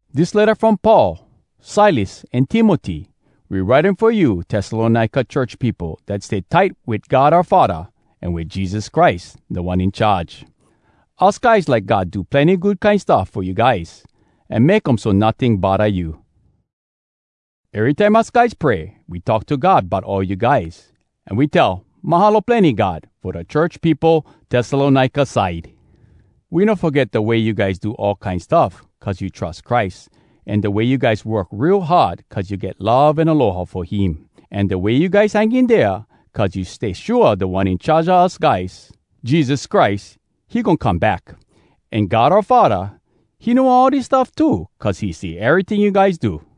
Dis letta from Paul, Silas, an Timoty. We write um fo you Tessalonika church peopo dat stay tight wit God oua Faddah an wit Jesus Christ, Da One In Charge. Us guys like God do plenny good kine stuff fo you guys, an make um so notting bodda you. Erytime us guys pray, we talk to God bout all you guys, an we tell, “Mahalo plenny, God, fo da church peopo Tessalonika side!” We no foget da way you guys do all kine stuff cuz you trus Christ, an da way you guys work real hard cuz you get love an aloha fo him, an da way you guys hang in dea cuz you stay shua dat Da One In Charge a us guys, Jesus Christ, he goin come back. An God oua Faddah, he know all dis stuff too cuz he see eryting you guys do.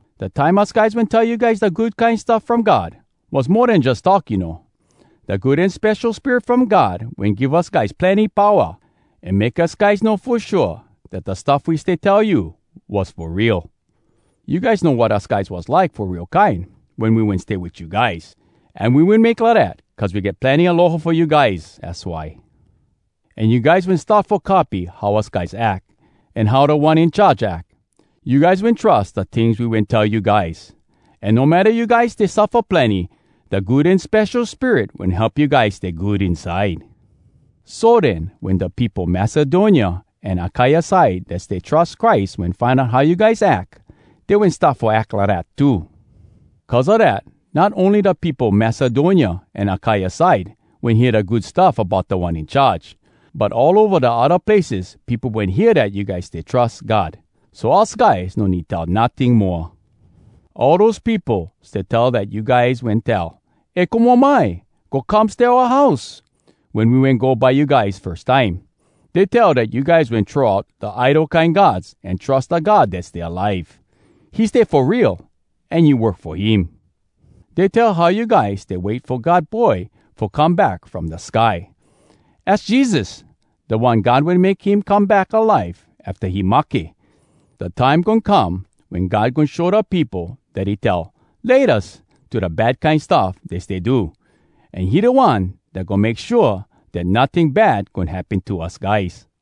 Dat time us guys wen tell you guys da Good Kine Stuff From God, was mo den jus talk, you know. Da Good An Spesho Spirit from God wen give us guys plenny powa, an make us guys know fo shua dat da stuff we stay tell you was fo real. You guys know wat us guys was like fo real kine wen we wen stay wit you guys. An we wen make lidat cuz we get plenny aloha fo you guys, az why. An you guys wen start fo copy how us guys ack, an how Da One In Charge ack. You guys wen trus da tings we wen tell you guys. An no matta you guys stay suffa plenny, da Good An Spesho Spirit wen help you guys stay good inside. So den, wen da peopo Macedonia an Akaia side dat stay trus Christ wen find out how you guys ack, dey wen start fo ack lidat too. Cuz a dat, not ony da peopo Macedonia an Akaia side wen hear da Good Stuff bout Da One In Charge, but all ova da odda places peopo wen hear dat you guys stay trus God. So us guys no need tell notting moa. All dose peopo stay tell dat you guys wen tell, “E komo mai! Go come stay oua house!” wen we wen go by you guys firs time. Dey tell dat you guys wen throw out da idol kine gods an trus da God dat stay alive. He stay fo real, an you work fo him. Dey tell how you guys stay wait fo God Boy fo come back from da sky. Az Jesus—da One God wen make him come back alive afta he mahke! Da time goin come wen God goin show da peopo dat he tell “Laytas” to da bad kine stuff dey stay do! An he da One dat goin make shua dat notting bad goin happen to us guys.